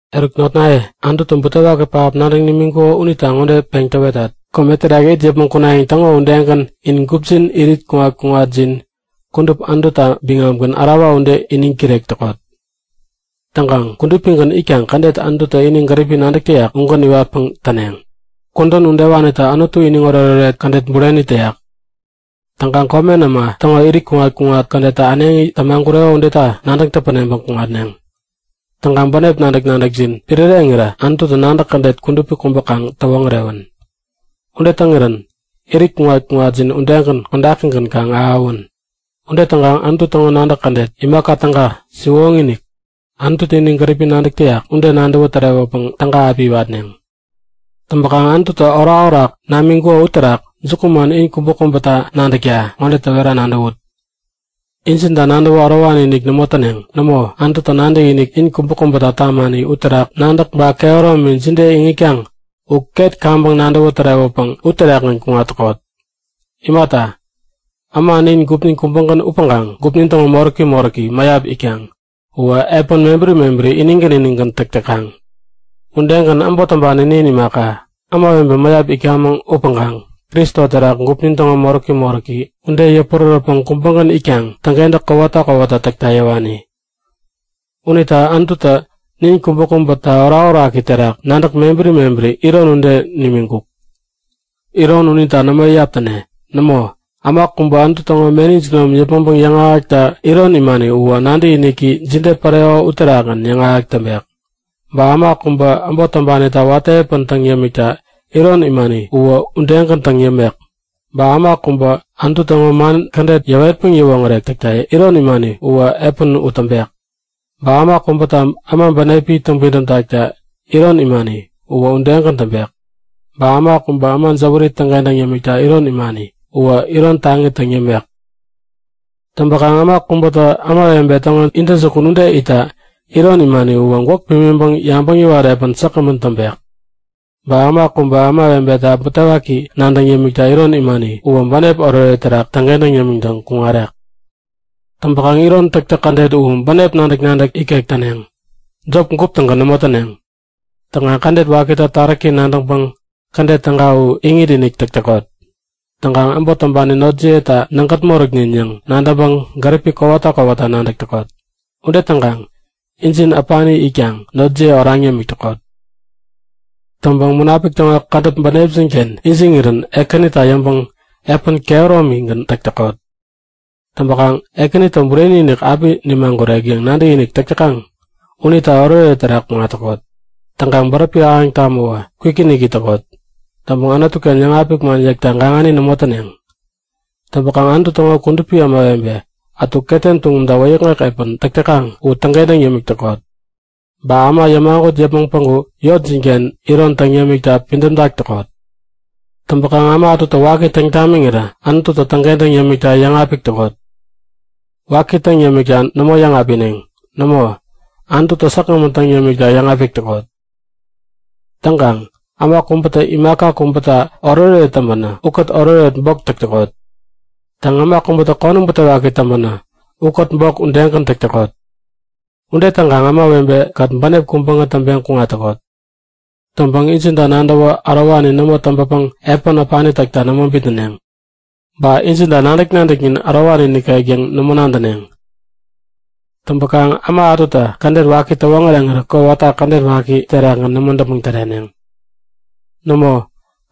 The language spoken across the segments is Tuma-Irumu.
Eruk notnaye, Anututä butewaki pähap nadäŋ nimiŋkuko unita ŋode peŋ täwetat; Kome terak it yäpmäŋ kunayäŋ täŋo udegän in gupjin irit kuŋat-kuŋatjin kudup Anututa biŋamgän ärawa ude iniŋ kirek täkot. Täŋkaŋ kudupigän itkaŋ kädet Anututä ini gäripi nadäk täyak ugän iwatpäŋ täneŋ. Kudän udewanitä Anutu iniŋ oretoret kädet bureni täyak. Täŋkaŋ komen äma täŋo irit kuŋat-kuŋat kädettä äneŋi tämagureko udeta nadäŋ täpäneŋpäŋ kuŋatneŋ. Täŋkaŋ bänep nadäk-nadäkjin piräreŋirä Anututä nadäk kädet kudupi kubä kaŋ täwoŋärewän. Ude täŋirän irit kuŋat-kuŋatjin udegän kodakigän kaŋ ahäwän. Ude täŋkaŋ Anutu täŋo nadäk kädet, imaka täga, siwoŋi-inik, Anututä ini gäripi nadäk täyak ude nadäwä tärewäpäŋ täga api iwatneŋ. Täŋpäkaŋ Anututä orakorak namiŋkuko uterak jukuman in kubäkubätä nadäkta ŋode täwera nadäwut; Injinta nadäwä ärowani-inik nämo täneŋ. Nämo, Anututä nadäkinik in kubäkubäta tamani uterak nadäk ba kehäromi jide iŋitkaŋ u ket kaŋpäŋ nadäwä tärewäpäŋ uterakgän kuŋat täkot. Imata, äma nin gupnin kubägän upäŋkaŋ gupnin täŋo moräki moräki mäyap itkaŋ uwä epän mebäri inigän inigän täk täkaŋ. Udegän äbot täŋpani nin imaka, ämawebe mäyap itkamäŋ upäŋkaŋ Kristo terak gupnin täŋo moräki moräki ude, yäpurärätpäŋ kubägän itkaŋ täŋkentäk kowata kowata täkta yäwani. Unita Anututä nin kubäkubäta orakoraki terak nadäk mebäri mebäri iron ude nimiŋkuk. Iron unita nämo iyap täne. Nämo, äma kubä Anutu täŋo meni jinom yäpmäŋpäŋ yäŋahäkta iron imani uwä nadäkiniki jide päreko uterakgän yäŋahäk täŋpek. Ba äma kubä äbot täŋpanita watä epän täŋ yämikta iron imani uwä udegän täŋ yämek. Ba äma kubä Anutu täŋo man kädet yäwetpäŋ yäwoŋärek täkta iron imani uwä epän u täŋpek. Ba äma kubätä äma bänepi täŋpidäm takta iron imani uwä udegän täŋpek. Ba äma kubä äma jäwäri täŋkentäŋ yämikta iron imani uwä iron taŋi täŋ yämek. Täŋpäkaŋ äma kubätä ämawebe täŋo intäjukun ude itta iron imani uwä gwäk pimiŋpäŋ yabäŋ yäwat epän säkgämän täŋpek. Ba äma kubä ämawebeta butewaki nadäŋ yämikta iron imani uwä bänep oretoret terak täŋkentäŋ yämiŋtäŋ kuŋarek. Täŋpäkaŋ iron täktäk kädet u bänep nadäk-nadäk ikek täneŋ. Jop gup-tägän nämo täneŋ. Täŋkaŋ kädet wakita taräki nadäŋpäŋ kädet täga u iŋit-inik täk täkot. Täŋkaŋ äbot täŋpani notjiyeta nägät moräknin yäŋ nadäŋpäŋ gäripi kowata kowata nadäk täkot. Ude täŋkaŋ injin äpani itkaŋ notjiye oraŋ yämik täkot. Täŋpäŋ Munapik täŋo kädäp bänepjin-ken ijiŋirän Ekänita yäŋpäŋ epän kehäromigän täk täkot. Täŋpäkaŋ Ekänitä bureni-inik api nimagurek yäŋ nadäkinik täk täkaŋ unita oretoret terak kuŋat täkot. Täŋkaŋ bäräpi ahäŋ tamäwä kwikinik it täkot. Täŋpäŋ Anutu-ken yäŋapik man yäkta gaŋani nämo täneŋ. Täŋpäkaŋ Anutu täŋo kudupi ämawebe ätu ketem tuŋumta wäyäkŋek epän täk täkaŋ u täŋkentäŋ yämik täkot. Ba äma yämagut yäpmäŋ päŋku yotjin-ken iron täŋ yämikta pidämtak täkot. Täŋpäkaŋ äma ätutä waki täŋ tamiŋirä Anututä täŋkentäŋ yämikta yäŋapik täkot. Waki täŋ yämikta nämo yäŋapineŋ. Nämo, Anututä säkgämän täŋ yämikta yäŋapik täkot. Täŋkaŋ äma kubätä imaka kubäta oretoret täŋpänä ukät oretoret bok täk täkot. Täŋ, äma kubätä konäm butewaki täŋpänä ukät bok udegän täk täkot. Ude täŋkaŋ ämawebe-kät bänep kubägän täŋpeŋ kuŋat täkot. Täŋpäŋ injinta nadäwä ärowani nämo täŋpäpäŋ epän äpani täkta nämo bitnäneŋ. Ba injinta nadäk-nadäknin ärowani nikek yäŋ nämo nadäneŋ. Täŋpäkaŋ äma ätutä kädet waki täwoŋäreŋirä kowata kädet waki terakgän nämo däpmäŋ täreneŋ. Nämo,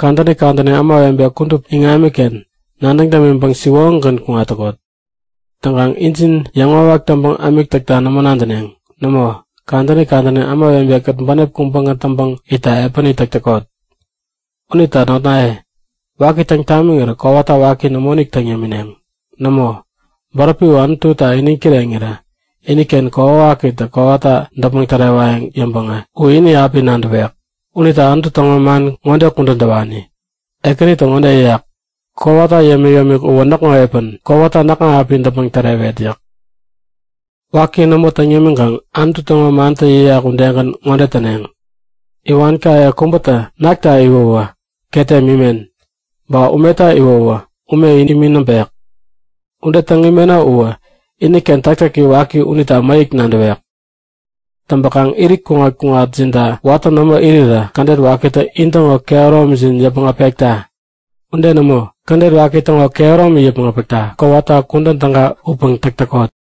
kadäni kadäni ämawebe kudup iŋamiken nadäŋ dämiŋpäŋ siwoŋigän kuŋat täkot. Täŋkaŋ injin yäŋwawak täŋpäŋ ämik täkta nämo nadäneŋ. Nämo, kadäni kadäni ämawebe-kät bänep kubägän täŋpäŋ itta epäni täk täkot. Unita notnaye, waki täŋ tamiŋirä kowata waki nämoinik täŋ yämineŋ. Nämo, bäräpi u Anututa iniŋ kireŋirä iniken kokwawakitä kowata däpmäŋ tärewayäŋ yäŋpäŋä u ini api nadäwek. Unita Anutu täŋo man ŋode kudän täwani; Ekänitä ŋode yäyak; Kowata yämik-yämik uwä näkŋo epän. Kowata näkŋa api däpmäŋ tärewet yäk. Waki nämo täŋ yämiŋkaŋ Anutu täŋo mantä yäyak udegän ŋode täneŋ; Iwankaye kubätä nakta iwäwä ketem imen, ba umeta iwäwä ume imi näŋpek. Ude täŋ imeno uwä iniken täktäki waki unita mäyäk nadäwek. Täŋpäkaŋ irit kuŋat-kuŋatjinta watä nämo irirä kädet wakitä intäŋo kehäromjin yäpmäŋ äpekta. Ude nämo, kädet waki täŋo kehäromi yäpmäŋ äpäkta kowata kudän täga upäŋ täk täkot.